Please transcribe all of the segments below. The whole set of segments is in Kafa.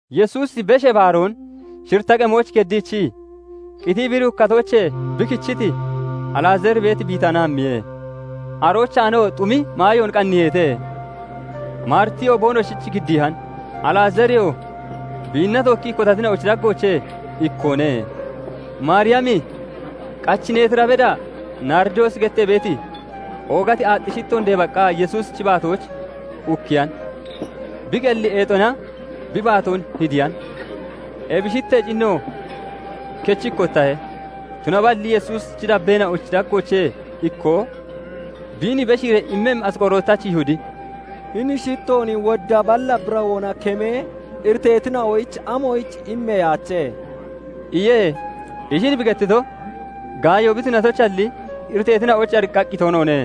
Yesuusi, Beshee Baaroon shiritta qemooch geddiichii, qitii bi duukkatoochee bi kichiti Alazaari beeti Bitaana hammiye. Aroochaanoo xumi maayoon qanniiheete; Maaritiyoo boonoshich giddiihan; Alazaariyoo biinna tookkii kotatina'ochi daggoochee ikkoone. Maariyami qachi neetira beda naaridoosi gettee beeti oogati aaxxi shittoon deebaqqa Yesuusichi baatooch ukkiyan; bi qelli eexona bi baatoon hidiyan. Ebi shittee cinno kechi ikkotahe. Tunaballi Yesuusi dabbeena'ochi daggoochee ikkoo, biin beshiiree immemmi Asqorootachi Yihudi "Hini shittoon wodda balla birawoona kemee, iriteetina'oyich amoyich immeyaache?" iye. Ishin bi gettito, gaayo bi tunatoyichalli, iriteetina'oyich ariqqaqqi toonoone;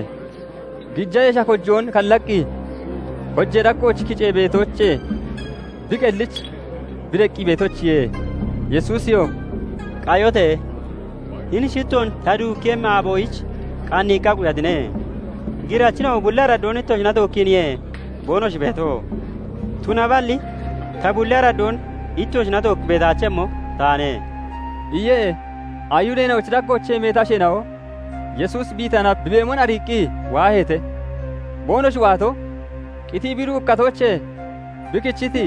gija yesha kojoon kallaqqi kojee daggooch kicee beetoochee bi qellich bi deqqi beetoyichiye. Yesuusiyoo "Qayote! Hini shittoon ta duukkeeyemmi aaboyich qanniiqqa quyatine. Girachina'o bulli araddoon ittoshina tookkiiniye boonoshi beeto; tunaballi ta bulli araddoon ittoshina tookki beetaachemmo taane" iye. Ayihudeena'ochi daggoochee meeti asheena'o Yesuusi Bitaana bi beemon ariiqqi waaheete; boonoshi waato, qitii bi duukkatoochee bi kichiti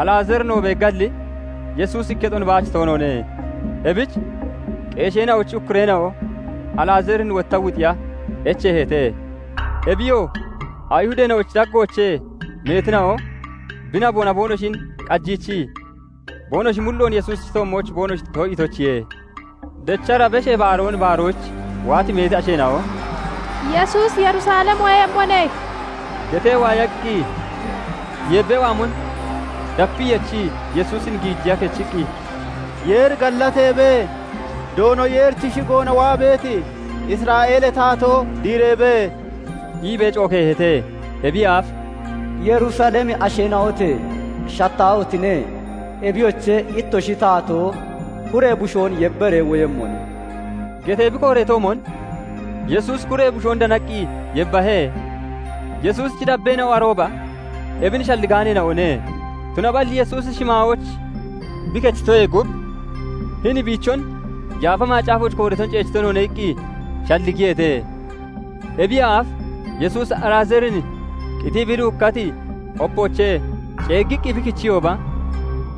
Alazaarinoo beeggalli Yesuusi ikketon baach toonoone. Ebich qeesheena'ochi ukkureena'o Alazaarin wotta wuxiya echeeheete; Ebiyoo Ayihudeena'ochi daggoochee meetina'o bi naboona boonoshin qajiichii boonoshi mulloon Yesuusichi toommooch boonoshi too'iitoyichiye. Dechara Beshee Baaroon baaroyich waati meeti asheena'o "Yesuusi Yerusalem woyemmone" getee waayaqqi, yeebbee waamon dapii yechii Yesuusin giijiya kechiqqi, "Yeeri gallateebe! Doono Yeerichi shigoona waa beeti Isra'eelee Taatoo diireebe!" iibee cookeeheete. Ebiyee aaf "Yerusalemi asheena'ote! Shattaahotine! Ebiyoche, ittoshi taatoo kuree bushoon yebbaree woyemmone" getee bi kooreetoomon Yesuusi kuree bushoon danaqqi yebbahe. Yesuusichi dabbeena'o arooba ebin shalligaaneena'one; tunaballi Yesuusi shimaayooch bi kechitoyee gub, "Hini biichon Yaafa Macaafooch kooreeton ceechito noone" iqqi shalligiyeete. Ebiyee aaf Yesuusi Alazaarin qitii bi duukkati opoochee ceeggiqqi bi kichiyooba,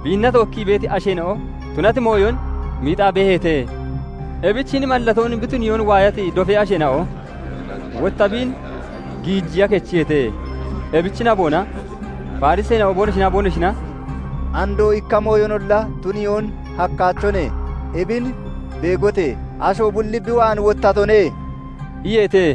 biinna tookkii beeti asheena'o tunati mooyon miixaa beeheete. Ebich hini mallatoon bi tuniyoon waayati dofee asheena'o wotta biin giijiya kechiyeete. Ebichi naboona Fariseena'o boonoshinaa boonoshina "Andoo ikka mooyonolla tuniyoon hakkaachone! Ebin beegote! Ashoo bulli bi waan wottatone" iyeete.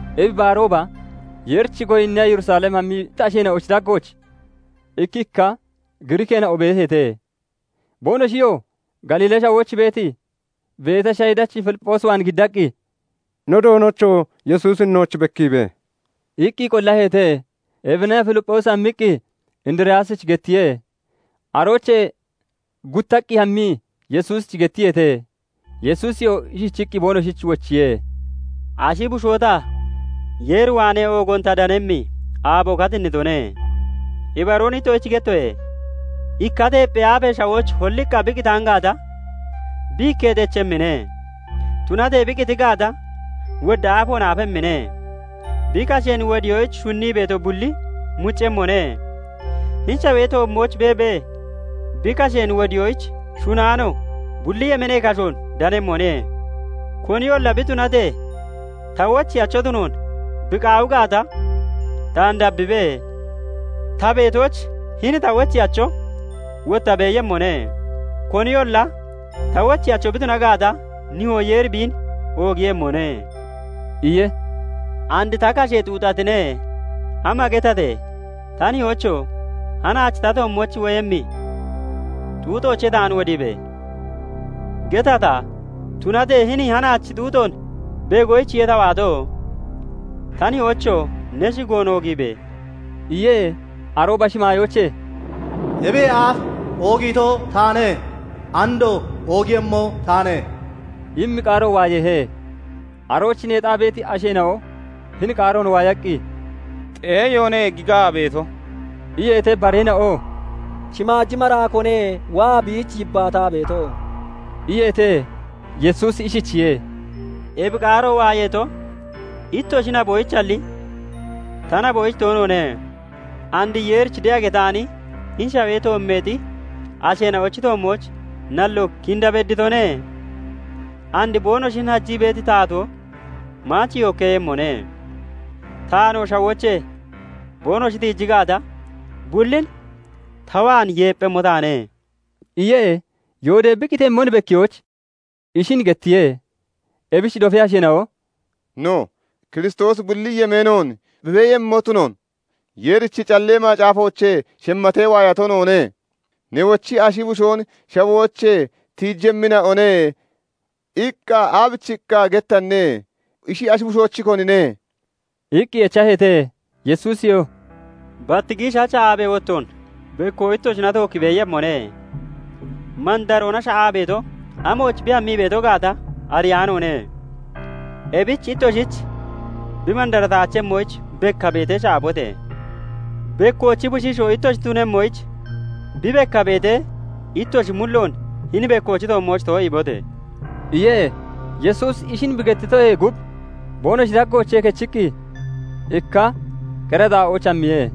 Ebi baarooba Yeerich goyinniya Yerusalem hammiti asheena'ochi daggooch ikkikka Giriikkeena'o beeheete. Boonoshiyoo Galiilee Shawooch beeti Beteshayidachi Filipphoos waan giddaqqi, "No doonocho! Yesuusin nooch bekkiibe!" iqqi qollaheete. Ebina Filipphoosi hammiqqi Indiriyaasich gettiye; aroochee guttaqqi hammii Yesuusich gettiyeete. Yesuusiyoo ishichiqqi boonoshich wochiye; "Ashi Bushoo ta, Yeer waanee oogoon ta deqqemmi aaboo katinnitone. Ibaroon ittoshich gettoye:- Ikka teepphee aafe shawooch holliqqa bi qitaan gaata, bi ikketi echemmine; tunatee bi qiti gaata, wodda aafoon aafemmine. Bi kasheen wodiyoyich shunnii beeto bulli muccemmone; hini shawee toommooch beebee bi kasheen wodiyoyich shunnaano, bulli yemeenee kashoon danemmone. Koniyolla bi tunatee ta wocheyacho tunoon bi qaawi gaata, taan dabbibe! Ta beetooch hini ta wocheyacho wotta beeyemmone. Koniyolla ta wocheyacho bi tuna gaata, Nihoo Yeeri biin oogiiyemmone" iye. "And ta kashe xuuxatine; ama getate? 'Ta Nihoocho! Hanaach ta toommooch woyemmi xuuxoochee taan wodiibe!' getata? Tunatee hini hanaachi xuuxoon beegoyichiye ta waato. Ta Nihoocho! Ne shigoon oogiibe!" iye. Arooba shimaayoochee "Ebiyee aaf oogiito taane; andoo oogiiyemmo taane" immi qaaro waayeehe. Arooch neexaa beeti asheena'o hini qaaroon waayaqqi, "Xeeyoone gigaa beeto" iyeete. Bareena'oo "Shimaaji maraakoone waa biich yibbaataa beeto" iyeete. Yesuusi ishichiye:- "Ebi qaaro waayeeto, ittoshi naboyichalli ta naboyich toonoone. And Yeerich de'a getaani hini shawee toommeexi asheena'ochi toommooch nalloo kinda bedditone; and boonoshin hajii beeti taatoo maach yookkeeyemmone. Taanoo shawoochee boonoshi tiiji gaata, bullin ta waan yeepphemmo taane" iye. Yoodee bi qitemmon bekkiyoyich ishin gettiye. Ebich dofee asheena'o "No, Kiristoosi bulli yemeenoon bi beeyemmo tunoon Yeerichi Callee Macaafoochee shemmatee waayato noone. Newochi 'Ashi Bushoon shawoochee tiijemmina'one' iqqa aabichiqqa gettanne? Ishi Ashi Bushochi konine?" iqqi echaheete. Yesuusiyoo "Bat giishacha aabee wottoon bekko ittoshina tookki beeyemmone. Mandaroona sha'aa beeto amooch bi hammii beeto gaata ariyaanoone; ebich ittoshich bi mandarataachemmoyich, bekka beetee sha'abote! Bekkoochi bushiishoo ittoshi tunemmoyich, bi bekka beetee, ittoshi mulloon hini bekkoochi toommooch too'iibote!" iye. Yesuusi ishin bi gettitoyee gub boonoshi daggoochee kechiqqi ikka qera xaa'ooch hammiye.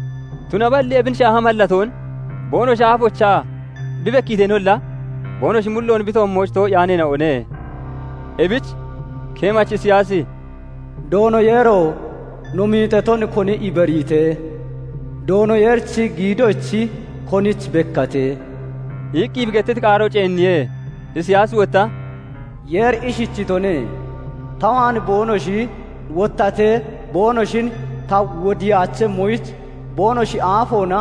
Tunaballi ebin shaaha mallatoon boonoshi aafoochaa bi bekkiiteenolla, boonoshi mulloon bi toommooch too'iyaaneena'one; Ebich keemachi Isiyaasi "Doono Yeero! No miixaton koni ibariite? Doono Yeerichi giidochi konich bekkaate?" iqqi bi gettiti qaaro ceenniye. Isiyaasi wotta "Yeeri ishichitone:- 'Ta waan boonoshi wottatee boonoshin ta wodiyaachemmoyich, boonoshi aafoona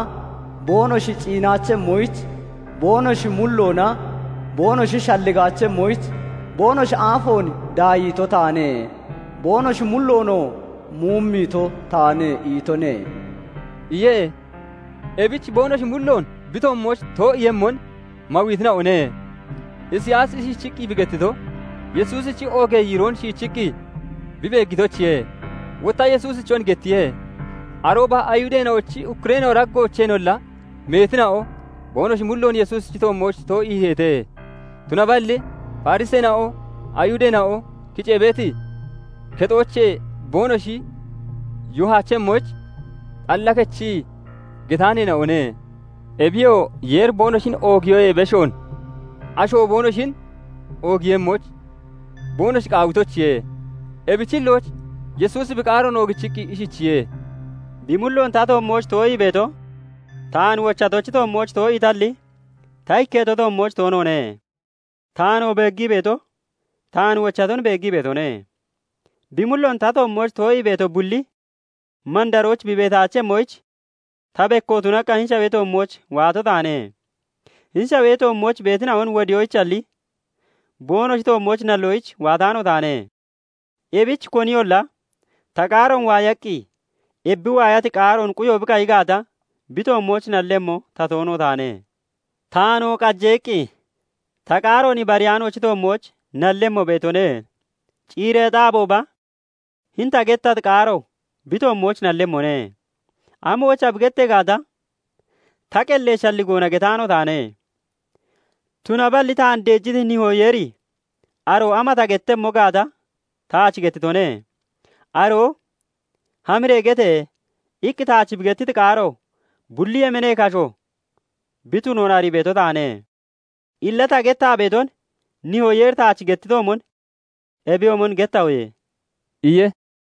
boonoshi ciinaachemmoyich, boonoshi mulloona boonoshi shalligaachemmoyich, boonoshi aafoon daayiito taane; boonoshi mulloonoo muumiitoo taane' itone" iye; ebich boonoshi mulloon bi toommooch too'iiyemmon mawiitina'one. Isiyaasi ishichiqqi bi gettito, Yesuusichi oogee yiiroon shiichiqqi bi beeggitoyichiye; wotta Yesuusichon gettiye. Arooba Ayihudeena'ochi ukkureena'o daggoocheenolla meetina'o boonoshi mulloon Yesuusichi toommooch too'iiheete; tunaballi Fariseena'o Ayihudeena'o kicee beeti kexoochee boonoshi yoohaachemmoyich, xalla kichii getaaneena'one; Ebiyoo Yeeri boonoshin oogiyoyee beshoon asho boonoshin oogiiyemmoyich boonoshi qaawitoyichiye. Ebichi hillooch Yesuusi bi qaaroon oogichiqqi ishichiye:- "Bi mulloon ta toommooch too'ii beeto, taan wochatochi toommooch too'iitalli, ta ikketo toommooch toonoone; Taanoo beeggii beeto, taan wochaton beeggii beetone. Bi mulloon ta toommooch too'ii beeto bulli, mandarooch bi beetaachemmoyich, ta, bekko tunaqqa hini shawee toommooch waato taane. "Hini shawee toommooch beetina'on wodiyoyichalli, boonoshi toommooch nalloyich waataano taane. Ebich koniyolla ta qaaroon waayaqqi ebi bi waayati qaaroon quyo bi qayi gaata, bi toommooch nallemmo ta toono taane. Taanoo qaje iqqi ta qaaroon ibariyaanoochi toommooch nallemmo beetone; ciireexi aabooba hini ta gettati qaaro bi toommooch nallemmone. 'Amoyicha?' bi gettee gaata, ta qellee shalligoona getaano taane; tunaballi taan deejiti Nihoo Yeeri aroo ama ta gettemmo gaata taach gettitone. Aroo 'Hamiree gete!' iqqi taach bi gettiti qaaro, bulli yemeenee kasho bi tunoon arii beeto taane. Illa ta gettaa beeton Nihoo Yeeri taach gettitoomon ebiyoomon gettahoye" iye.